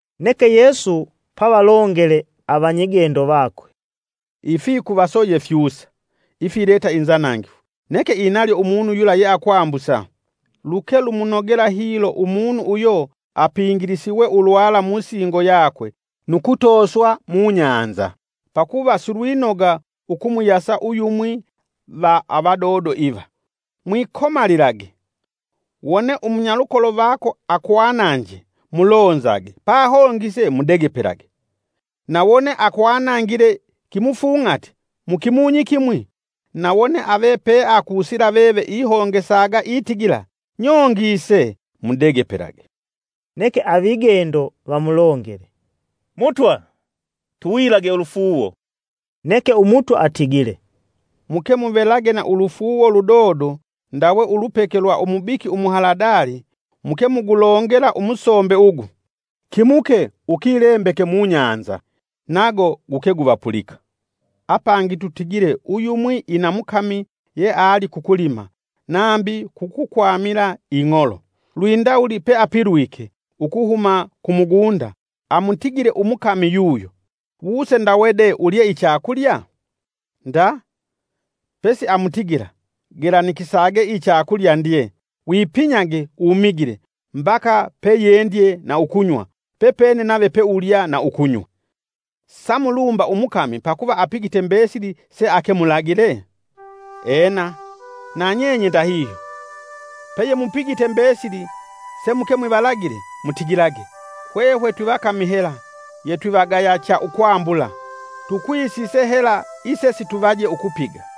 Neke Yesu pavalongele avanyigendo vakwe, “Ifikuvaso ye fyusa, ifileta inzanangifu, neke inalyo umunu yula yeakwambusa. Luke lumunogela hilo umunu uyo apingilisiwe ulwala musingo yakwe nu kutooswa mubahali pakuva silwinoga ukumuyasa uyumwi va avadodo iva. Mwikomalilage! Wone umunyalukolo vako akwananje mulonzage pahongise mudegepelage. Na wone akwanangile kimufung'ati mu kimunyi kimwi, na wone ave peakusila veve ihongesaga itigila, ‘Nyongise’ mudegepelage.” Neke avigendo vamulongele, “Mutwa! Tuwilage ulufuuwo.” Neke Umutwa atigile, “Muke muvelage na ulufuuwo ludodo ndawe ulupeke lwa umubiki umuhaladali muke mugulongela umusombe ugu, ‘Kimuke ukilembeke mu bahali’, nago guke guvapulika. “Apangi tutigile uyumwi ina mukami yeali kukulima, nambi kukukwamila ing'olo, lwindawuli peapilwike, ukuhuma ku mugunda, amutigile umukami yuyo, ‘Wuse ndawe de ulye ichakulya?’ Nda! Pesiamutigila, ‘gelanikisage ichakulya ndye, wipinyage umigile mbaka peyendye na ukunywa, pepene nave peulya na ukunywa.’ Samulumba umukami pakuva apigite mbesili seake mulagile? Ena, na nyenye ndahihyo, peyemupigite mbesili semuke mwivalagile, mutigilage, ‘Hwehwe twivakami hela yetwivagaya cha ukwambula, tukwisise hela isesituvaje ukupiga.’”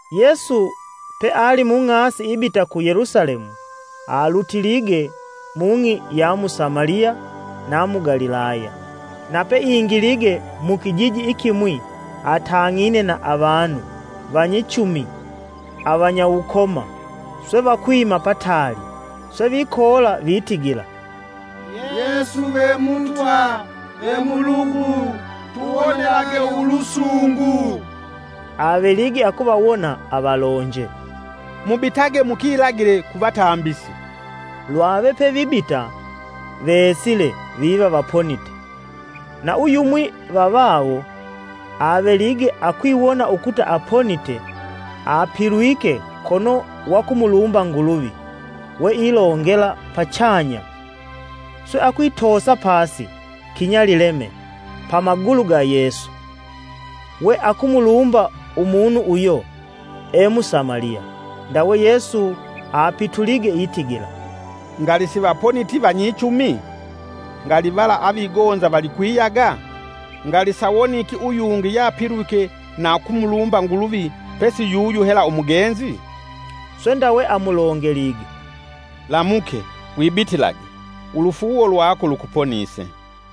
Yesu peali mung'asi ibita ku Yelusalemu, alutilige mung'i ya mu Samaliya na mu Galilaya. Na peingilige mukijiji ikimwi, atang'ine na avanu vanyichumi avanyauwukoma swe vakwima pataali. Swe vikoola vitigila, “Yesu ve Mutwa, ve mulugu tuwonelage ulusungu.” Avelige akuvawona avalonje, “Mubitage mukilagile kuvatambisi.” Lwave pevibita vesile viva vaponite. Na uyumwi va vawo avelige akwiwona ukuta aponite, apilwike kono wakumulumba Nguluvi we ilongela pachanya. Swe akwitoosa pasi kinyalileme pa magulu ga Yesu, we akumulumba umunu uyo e Musamaliya. Ndawe Yesu apitulige itigila, “Ngali sivaponiti vanyichumi? Ngali vala avigonza valikwiyaga? Ngali sawoniki uyungi yapilwike na ukumulumba Nguluvi, pesi yuyu hela umugenzi?” Swe ndawe amulongelige, “Lamuke, wibitilage, ulufuuwo lwako lukuponise.”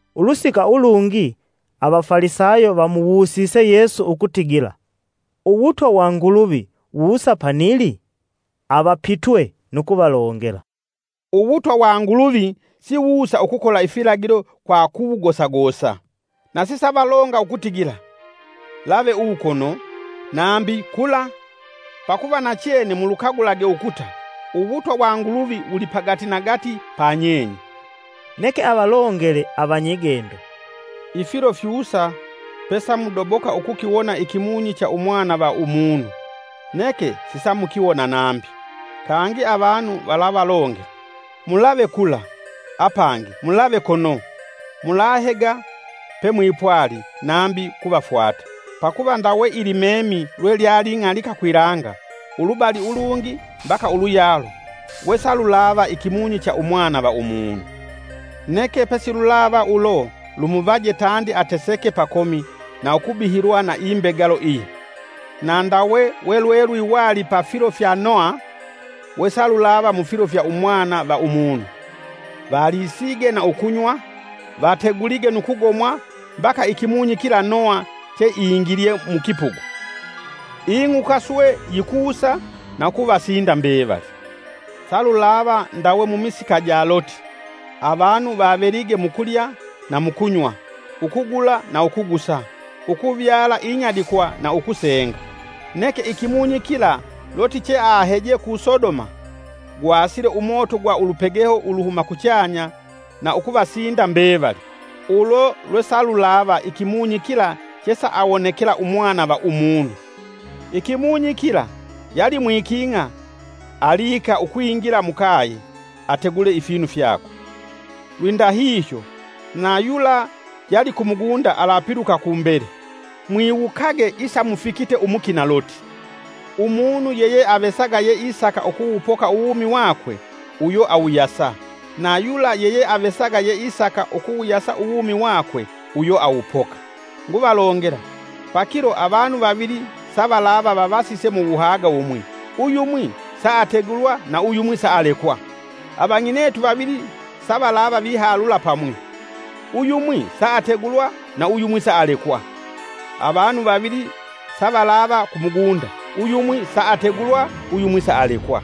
Ulusika ulungi Avafalisayo vamuwusise Yesu ukutigila, “Uwutwa wa Nguluvi wusa panili?” Avapitwe nu kuvalongela, “Uwutwa wa Nguluvi Siwuusa ukukola ifilagilo kwa kuwugosagosa. Na sisavalonga ukutigila, ‘Lave uwu kono’, nambi, ‘Kula’. Pakuva nachene mulukagulage ukuta, uwutwa wa Nguluvi wuli pagati nagati pa nyenye.” Neke avalongele avanyigendo, “Ifilo fyusa pesamudoboka ukukiwona ikimunyi cha Umwana va Umunu, neke sisamukiwona nambi. Kangi avanu valavalongela, ‘Mulave kula’ apangi ‘Mulave kono’; mulahega pemwipwali nambi kuvafwata. Pakuva ndawe ilimemi lwe lyaling'alika kwilanga ulubali ulungi mbaka uluyalo wesalulava ikimunyi cha Umwana va Umunu. Neke pesilulava ulo lumuvaje tandi ateseke pakomi na ukubihilwa na imbegalo iyi. Na ndawe we lwelwiwali pa filo fya Noha, wesalulava mufilo fya Umwana va Umunu. Valisige na ukunywa, vategulige nu kugomwa, mbaka ikimunyi kila Noha che ingilye mukipugu, ing'uka swe yikusa na ukuvasinda mbevali. Salulava ndawe mumisika ja Loti. Avanu vavelige mukulya na mukunywa, ukugula na ukugusa, ukuvyala inyadikwa na ukusenga. Neke ikimunyi kila Loti cheaheje ku Sodoma, gwasile umoto gwa ulupegeho uluhuma kuchanya na ukuvasinda mbevali. Ulo lwesalulava ikimunyi kila chesaawonekela Umwana va Umunu. “Ikimunyi kila, yali mwiking'a, aliika ukwingila mukaye ategule ifinu fyakwe. Lwindahihyo, na yula yali kumugunda alapiluka kumbele. Mwiwukage isamufikite umukina Loti. Umunu yeyeavesaga yeisaka ukuwupoka uwumi wakwe, uyo awuyasa; na yula yeyeavesaga yeisaka ukuwuyasa uwumi wakwe uyo awupoka. Nguvalongela, pakilo avanu vavili savalava vavasise muwuhaga wumwi; uyumwi saategulwa na uyumwi saalekwa. Avang'inetu vavili savalava vihalula pamwi; uyumwi saategulwa, na uyumwi saalekwa. [ Avanu vavili savalava kumugunda, uyumwi saategulwa, uyumwi saalekwa.”]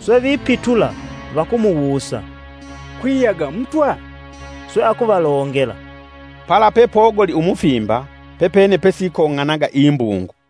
Swe vipitula vakumuwusa, “Kwiyaga Mutwa?” Swe akuvalongela, “Pala pepogoli umufimba, pepene pesikong'onaga imbungu.”